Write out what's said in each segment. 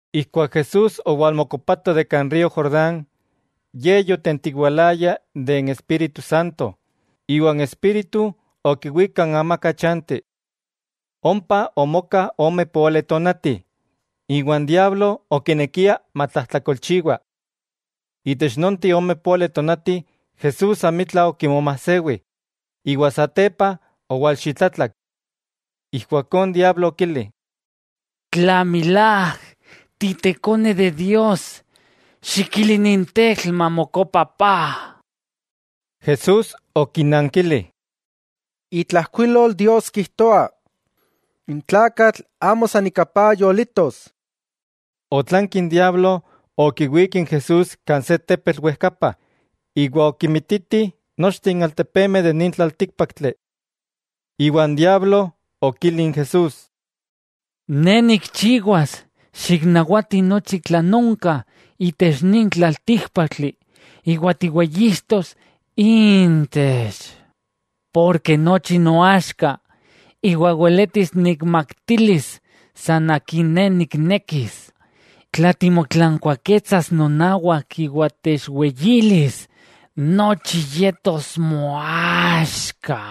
Ijkuak Jesús owalmokopato kan río Jordán, Ye yotentiwalaya de n Espíritu Santo, iwa n Espíritu okiwík kan amaka chanti. Ompa omoka ome póali tonati, iwa n diablo okinekia matlajtlakolchiwa. Itech nonteh ome póali tonati Jesús amitla okimomajsewi, iwa satepa owalxitlatlak. Ijkuakó n diablo okili: —Tla milák Te Ikone Dios, xikili nin tetl mamokopa paj. Jesús okinankili: —Itlajkuilol Dios kijtoa: “N tlakatl amo san ika paj yolitos.” Otlanki n diablo okiwík n Jesús kan se tepetl wejkapa, iwa okimititi nochteh n altepemeh de nin tlaltíkpaktli. Iwa n diablo okili n Jesús: —Ne nikchiwas xiknawati nochi tlan onka itech nin tlaltíkpaktli iwa tiweyixtos intech. Porke nochi noaxka, iwa weletis nikmaktilis san akin ne niknekis. Tla timotlankuaketsas nonawak iwa techweyilis, nochi yetos moaxka.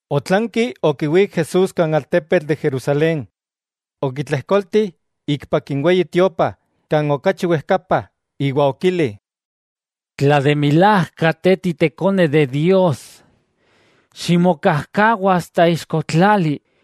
Otlanki okiwík n Jesús kan altepetl de Jerusalén, okitlejkolti ikpak n Weyi Tiopa kan okachi wejkapa iwa okili: —Tla milák Te Ikone Dios, ximokajkawa ixko tlali,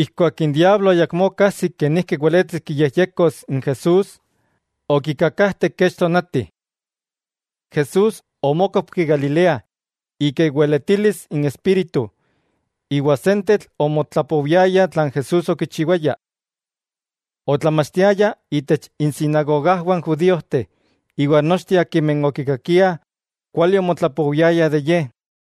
Ijkuak n diablo ayakmó okajsik kenijki weletis kiyejyekos n Jesús, okikakajte kech tonati. Jesús omókopki Galilea ika iweletilis n Espíritu, iwa sentetl omotlapowiayah tlan Jesús okichiwaya. Otlamachtiaya itech insinagogajwah n judíojteh, iwa nochteh akimeh okikakiah, kuali omotlapowiayah de Ye.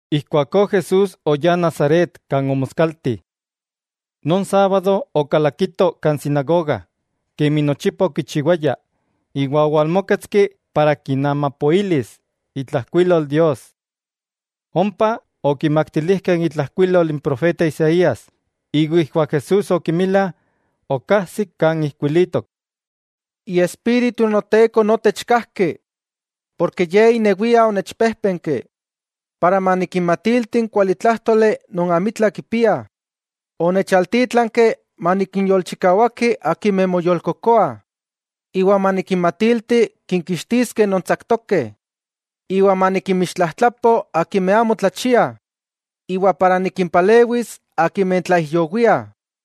Ijkuakó Jesús oyá Nazaret kan omoskalti. Non sábado okalakito kan sinagoga, kemi nochipa okichiwaya, iwa owalmóketski para kinamapoilis itlajkuilol Dios. Ompa okimaktilijkeh itlajkuilol n profeta Isaías, iwa ijkuak Jesús okimila, okajsik kan ijkuilitok: Iespíritu n Noteko notech kajki, ken Ye inewia onechpéjpenki para manikinmatilti n kualitlájtoli non amitla kipiah, onechaltítlanki manikinyolchikawaki akimeh moyolkokoah, iwa manikinmatilti kinkixtiskeh non tsaktokeh; iwa manikinmixtlajtlapo akimeh amo tlachiah, iwa manikinpalewi akimeh tlaijyowiah,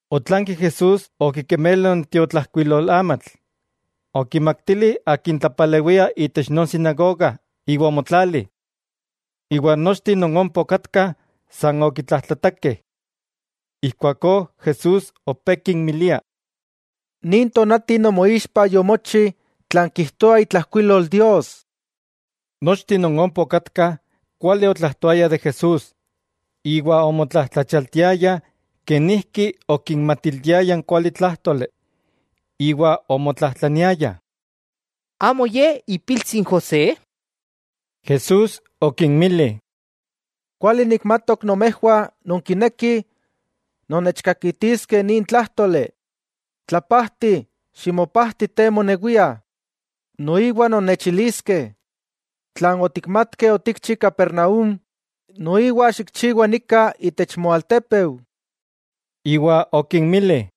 Otlanki Jesús okimemelo n tiotlajkuilolamatl, okimaktili akin tlapalewia itech non sinagoga iwa omotlali. Iwa nochteh non ompa okatkah, san okitlajtlatakeh, ijkuakó Jesús opé kinmilia: —Nin tonati nomoixpa yomochi tlan kijtoa itlajkuilol Dios. Nochteh non ompa okatkah kuali otlajtoayah de Jesús iwa omotlajtlachialtiayah kenijki okinmatiltiaya n kualitlájtoli. Iwa omotlajtlaniayah: —¿Amo ye ipiltsi n José? Jesús okinmili: —Kuali nikmatok nomejwah nonkinekih nonnechkakitiskeh nin tlájtoli: “Tlapajti, ¡ximopajti te monewia!”, noiwa nonnechiliskeh: “Tlan otikmatkeh otikchi Capernaúm, noiwa xikchiwa nika itech moaltepeu.” Iwa okinmili: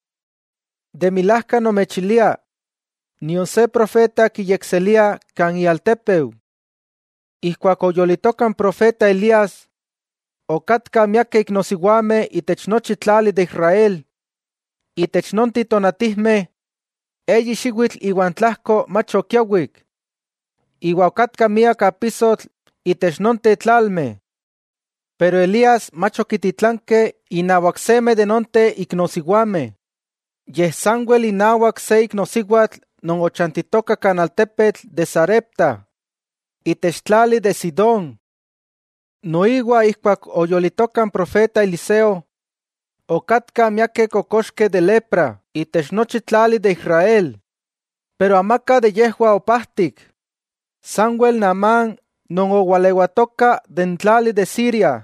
—De milajka nomechilia, nion se profeta kiyekseliah kan ialtépeu. Ijkuak oyolitoka n profeta Elías, okatkah miakeh iknosiwameh itech nochi tlali de Israel, itech nonteh tonatijmeh eyi xiwitl iwa n tlajko mach okiawik, iwa okatka miak apisotl itech nonteh tlalmeh, pero Elías mach okititlankeh inawak seme de nonteh iknosiwameh, yej sanwel inawak se iknosiwatl non ochantitoka kan altepetl de Sarepta, itech tlali de Sidón. Noiwa ijkuak oyolitoka n profeta Eliseo, okatkah miakeh kokoxkeh de lepra itech nochi tlali de Israel, pero amaka de yejwah opajtik, sanwel Naamán non owalewatoka itech tlali de Siria.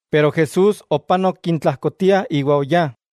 Pero Jesús opanok intlajkotiah iwa oyá.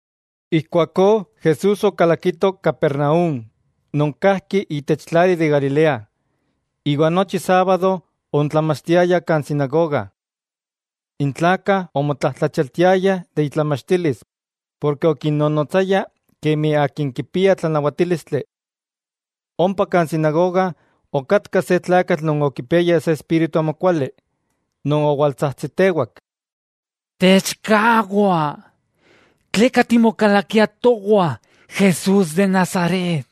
Ijkuakó Jesús okalakito Capernaúm non kajki itech tlali de Galilea, iwa nochi sábado oontlamachtiaya kan sinagoga. N tlakah omotlajtlachialtiayah ika itlamachtilis porke okinnonotsaya kemi akin kipia tlanawatílistli. Ompa kan sinagoga okatka se tlakatl non okipiaya se espíritu amokuali, non owaltsajtsitewak: —Techkawa, ¿tleka timokalakia towah, Jesús de Nazaret?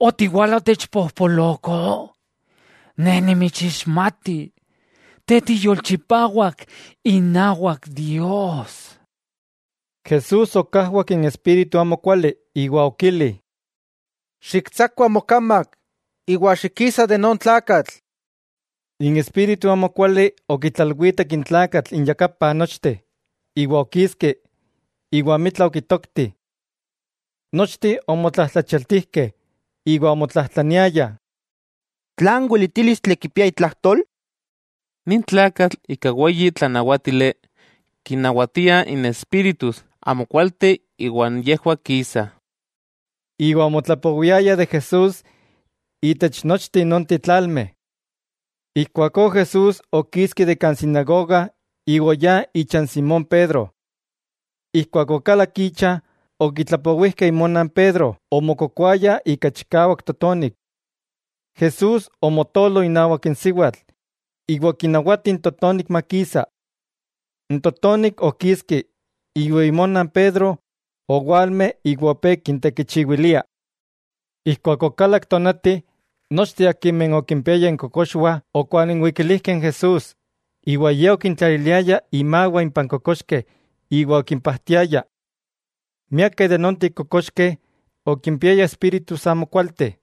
¿Otiwala otechpojpoloko? Ne nimitsixmati, Te tiyolchipawak inawak Dios. Jesús okajwak n espíritu amokuali, iwa okili: —¡Xiktsakua mokamak, iwa xikisa de non tlakatl! N espíritu amokuali okitlalwitek n tlakatl inyakapah nochteh iwa okiski, iwa amitla okitokti. Nochteh omotlajtlachialtijkeh, iwa omotlatlajtlaniayah: —¿Tlan weletílistli kipia itlajtol? ¡Nin tlakatl ika weyi tlanawátili kinnawatia n espíritus amokualteh iwa yejwah kisah! Iwa omotlapowiayah de Jesús itech nonteh tlalmeh. Ijkuakó Jesús okiski de kan sinagoga iwa oyá icha n Simón Pedro. Ijkuak okalak icha okitlapowijkeh imona n Pedro omokokoaya ika chikawak totonik. Jesús omotolo inawak n siwatl iwa okinawati n totonik makisa. N totonik okiski iwa imona n Pedro owalme iwa opé kintekichiwilia. Ijkuak okalak tonati, nochteh akimeh okimpiayah inkokoxwah okwalinwikilijkeh n Jesús, iwa Ye okintlaliliaya imawah impah n kokoxkeh iwa okimpajtiaya. Miakeh de nonteh kokoxkeh okimpiayah espíritus amokualteh,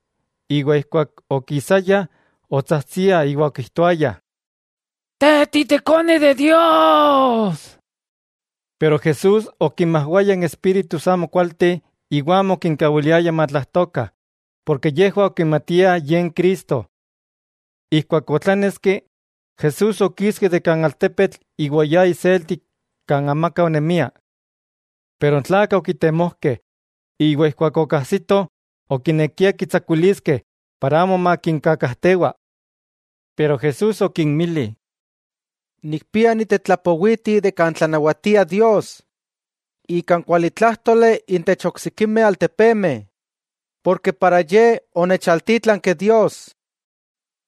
iwa ijkuak okisayah otsajtsiah iwa okijtoayah: —Te Ikone Dios. Pero Jesús okinmajwaya n espíritus amokualteh iwa amo okinkawiliaya matlajtokah, porke yejwah okimatiah Ye n Cristo. Ijkuak otláneski, Jesús okiski de kan altepetl iwa oyá iselti kan amaka onemia. Pero n tlakah okitemojkeh, iwa ijkuak okajsitoh, okinekiah kitsakuiliskeh para amo makinkakajtewa. Pero Jesús okinmili: —Nikpia nitetlapowiti de kan tlanawatia Dios ika n kualitlájtoli intech oksikimeh altepemeh, ken ika ye onechaltítlanki Dios.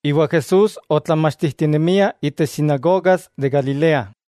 Iwa Jesús otlamachtijtinemia itech sinagogas de Galilea.